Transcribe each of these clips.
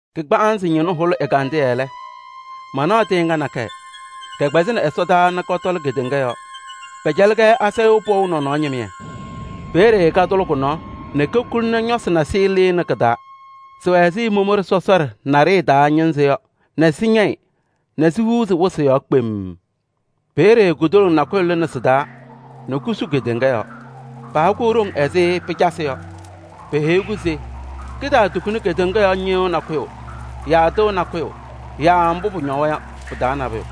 Kagbaanzɩ ñɩnʋ hʋlɩ ɛgandɩyɛ lɛ, mana tɩɩŋa nakɛyɛ, kɛkpɛzɩnɩ ɛsɔdaa nɛ kɔtɔlɩ kedeŋa yɔɔ. Pɛcɛlɩ-kɛ asayʋʋ pɔʋ nɔnɔɔ ñɩmɩyɛ. Peeye katʋlɩ kʋ-nɔɔ nɛ kokuli nɛ ñɔsɩ nasɩyɩ lɩɣnɩ kɩ-taa. Sɩwɛ ɛzɩ momoɖe sɔsɔɖɛ naɖɩyɛ taa ñɩnzɩ yɔ nɛ sɩñɛyɩ nɛ sihuuzi wɩsɩ yɔɔ kpemm. Peeye kudoloŋ nakʋyʋ lɩnɩ sɩ-taa nɛ kusu kedeŋa yɔɔ. Paha-kʋ ɖoŋ ɛzɩ pɩcasɩ yɔ. Peheyi-kʋ se kɩtaatukuni kedeŋa yɔɔ ñɩyʋʋ nakʋyʋ yaa tɩʋ nakʋyʋ yaa mbʋ pʋñɔwa yɔ, pɩ-taa nabʋyʋ.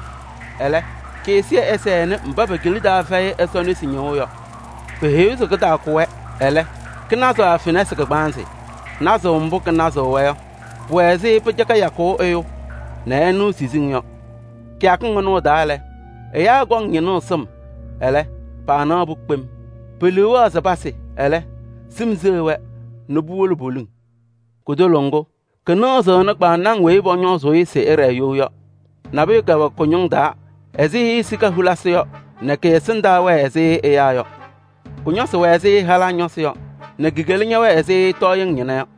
Ɛlɛ, kɩ-ɛzɩyɛ ɛsɛnɩ mba pe-kila taa fɛyɩ Ɛsɔ nesi ñɩɣʋ yɔ. Peheyi-kʋ se kɩtaakʋ-wɛ, ɛlɛ, kɩnazɩ-wɛ fenasɩ kagbaanzɩ. Nazʋʋ mbʋ kɩnazɩɣ-wɛ yɔ, pʋwɛ ɛzɩ pɩcaka yakʋʋ ɛyʋ nɛ ɛnɩɣ siziŋ yɔ. Kɩyakɩŋ ɩnʋ ɩ-taa lɛ, ɛyaa kɔŋ ñɩnʋʋ sɩm, ɛlɛ, paanaɣ-pʋ kpem. Pe-liu wɛɣ se pasɩ, ɛlɛ, sɩm seɣ-wɛ nɛ puwolo poliŋ. Kutoloŋ ŋgʋ, kɩnɩɣzɩnɩ kpaŋnaŋ weyi pɔñɔɔzɩ-ɩ se ɩɖɛɛ you yɔ. Nabʋyʋ kɛwɛ kʋ-ñʋŋ taa ɛzɩ sika hulisi yɔ nɛ kɩ-ɛsɩndaa wɛɛ ɛzɩ ɛyaa yɔ. Kʋ-ñɔsɩ wɛ ɛzɩ halaa ñɔsɩ yɔ nɛ ki-kela ñɛwɛɛ ɛzɩ tɔɔyɩŋ ñɩna yɔ.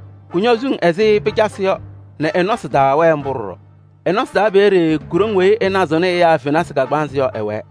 Kʋñɔ suŋ ɛzɩ pɩcasɩ yɔ nɛ ɩ-nɔsɩ taa wɛɛ ɖɔɖɔ mbʋ. Ɩ-nɔsɩ taa peeye ku-ɖoŋ weyi kɩnazɩɣnɩ ɛyaa fenasɩ kagbaanzɩ yɔ, ɛwɛɛ.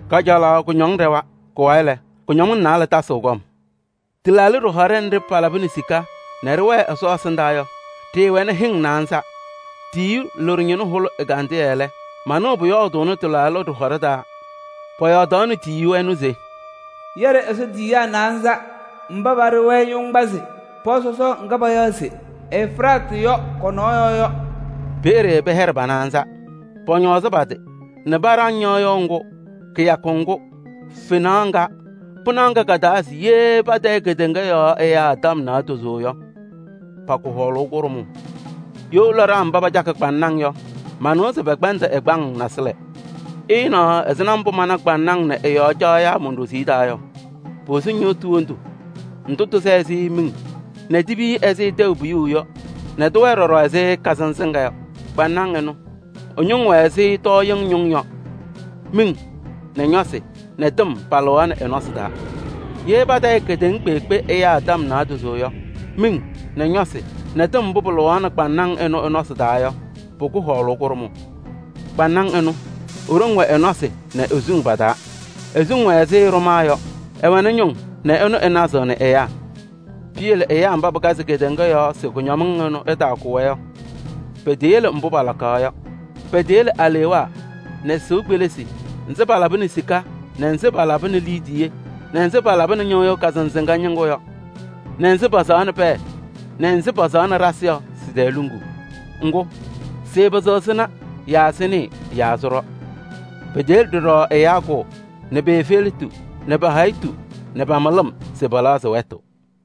Kajalaɣ kʋñɔŋ ɖɛwa. Kʋ-wayɩ lɛ, kʋñɔmɩŋ naalɛ tasɩɣ kɔm. Tɩlaaɖɩ ɖɩhɔɖɛ nɖɩ palabɩnɩ sika nɛ ɖɩwɛɛ Ɛsɔ ɛsɩndaa yɔ, ɖɩɩwɛnɩ hɩŋ naanza. Tiyiyu loɖo ñɩnʋ hʋlɩ ɛgandɩyɛ lɛ, manɩɣ pʋyɔɔdʋʋnɩ ɩ-taa. Pʋyɔɔdaɣnɩ tiyiyu ɛnʋ se: “Yɛɖɩ Ɛsɔ tiyiyaa naanza mba paɖɩ-wɛ yoŋgbasɩ pɔɔ sɔsɔɔ ŋga payaɣ se Efiraatɩ yɔ kɔ-yɔɔ yɔ.” Peeye pɛhɛɖɩ pa-naanza. Paañɔɔzɩ pa-tɩ nɛ paɖaŋ ñɩɣyʋʋ ŋgʋ, kɩyakʋ ŋgʋ, fenaɣ ŋga, pɩnaɣ ŋga ka-taa se ye patayɩ kedeŋa yɔɔ ɛyaa tɔm naadozo yɔ, pakʋ hɔɔlʋʋ kʋɖʋmʋʋ. You laɖaa mba pacakɩ kpaŋnaŋ yɔ, manɩwa se pɛkpɛndɩ ɛgbaŋ nasɩlɛ. Ɩɩnaɣ ɛzɩma mbʋ mana kpaŋnaŋ nɛ ɩ-yɔɔ caɣyaa mon-ɖoziye taa yɔ: posu ñɩɣtʋ wondu ndʋ tɩsɛ ɛzɩ miŋ nɛ tipiyi ɛzɩ tɛʋ piyuu yɔ nɛ tɩwɛɛ ɖɔɖɔ ɛzɩ kazɩnzɩŋa yɔ. Kpaŋnaŋ ɩnʋ, ɩ-ñʋŋ wɛ ɛzɩ tɔɔyɩŋ ñʋŋ yɔ, miŋ nɛ ñɔsɩ nɛ tɩm palɩɣaɣnɩ ɩ-nɔsɩ taa. Ye patayɩ kedeŋa kpeekpe ɛyaa tɔm naadozo yɔ, miŋ nɛ ñɔsɩ nɛ tɩm mbʋ pɩlɩɣaɣnɩ kpaŋnaŋ ɩnʋ ɩ-nɔsɩ taa yɔ, pʋkʋ hɔɔlʋʋ kʋɖʋmʋʋ. Kpaŋnaŋ ɩnʋ, i-ɖoŋ wɛ ɩ-nɔsɩ nɛ i-suŋ pa-taa. I-suŋ wɛ ɛzɩ ɖʋmaa yɔ: ɩwɛnɩ ñʋŋ nɛ ɩnʋ ɩnazɩɣnɩ ɛyaa. Piyele ɛyaa mba pɩkazɩ kedeŋa yɔɔ se kʋñɔmɩŋ ɩnʋ ɩtakʋ-wɛ yɔ, peteyele mbʋ palaɣkaɣ yɔ. Peteyele alewaa nɛ sɩʋ kpelisi nzɩ palabɩnɩ sika nɛ nzɩ palabɩnɩ liidiye nɛ nzɩ palabɩnɩ ñɩɣyʋʋ kazɩnzɩŋa ñɩŋgʋ yɔ nɛ nzɩ pasaɣnɩ pɛɛ nɛ nzɩ pasaɣnɩ ɖasɩ yɔ, sɩ-tɛɛ luŋuu. Ŋgʋ, sɩɩpɩzɩɣ sɩna yaa sɩnɩɩ yaa sɩɖɔ. Peteyele ɖɔɖɔ ɛyaa kʋʋ, nɛ pe-efeletu nɛ pa-hayitu nɛ pa-mɩlɩm se pɛlɛɣzɩ wɛtʋ.